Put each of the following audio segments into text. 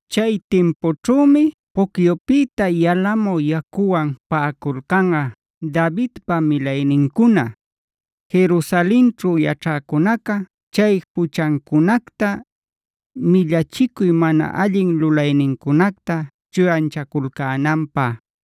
“Chay timpućhümi pucyupïta yalamü yacuwan paꞌaculcanꞌa Davidpa milaynincuna, Jerusalenćhu yaćhäcunaca chay juchancunacta, millachicuy mana allin lulaynincunacta chuyanchaculcänanpä.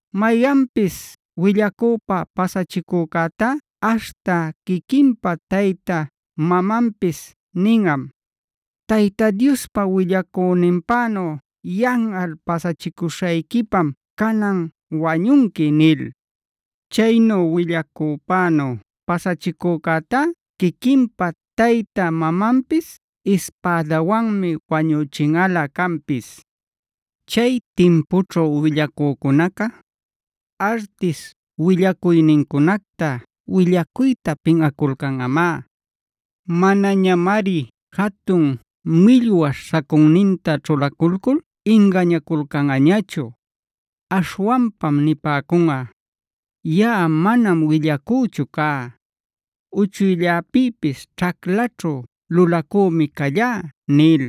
“Mayanpis willacüpa pasachicücätá aśhta quiquinpa tayta mamanpis ninꞌam: ‘Tayta Diospa willacüninpänu yanꞌal pasachicuśhayquipam canan wañunqui’ nil. Chaynu willacüpänu pasachicücätá quiquinpa tayta mamanpis ispädawanmi wañüchinꞌalä canpis. “Chay timpućhu willacücunaca, artish willacuynincunacta willacuyta pinꞌaculcanꞌamá. Manañamari jatun millwaśh sacunninta ćhulaculcul ingañaculcanꞌañachu. Aśhwanpam nipäcunꞌa: ‘Yaꞌa manam willacüchu cá; uchuylläpïpis ćhaclaćhu lulacümi callá’ nil.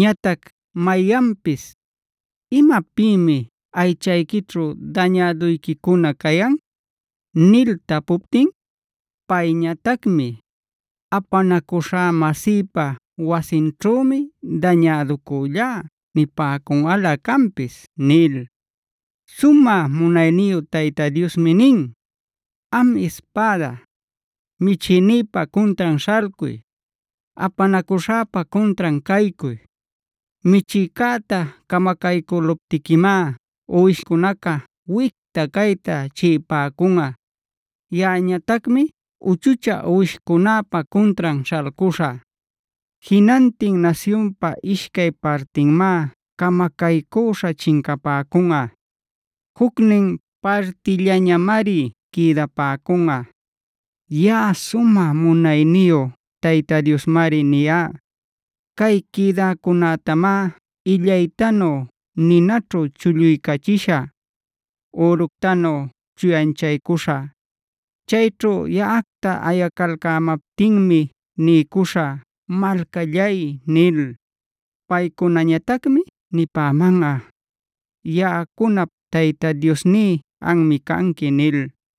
Ñatac mayanpis: ‘¿Imapïmi aychayquićhu dañäduyquicuna cayan?’ nil tapuptin, payñatacmi: ‘Apanacuśhä-mäsïpa wasinćhümi dañäducüllá’ nipäcunꞌalä canpis” nil. Sumä munayniyu Tayta Diosmi nin: “Am ispäda, michïnïpa cuntran śhalcuy; apanacuśhäpa cuntran caycuy. Michïcäta camacaycüluptiquimá uwishcunaca wicta cayta chiꞌipäcunꞌa. Yaꞌañatacmi uchuchä uwishcunäpa cuntran śhalcuśhä. Jinantin nasyunpa ishcay partinmá camacaycüśha chincapäcunꞌa. Jucnin partillañamari quïdapäcunꞌa. Yaꞌa sumä munayniyu Tayta Diosmari niyá. Cay quïdäcunätamá illaytanu ninäćhu chulluycachishä, üructanu chuyanchaycuśhä. Chayćhu yaꞌacta ayacalcämaptinmi niycuśhä ‘Malcallay’ nil. Paycunañatacmi nipämanꞌa: ‘Yaꞌacunap Tayta Diosní anmi canqui’” nil.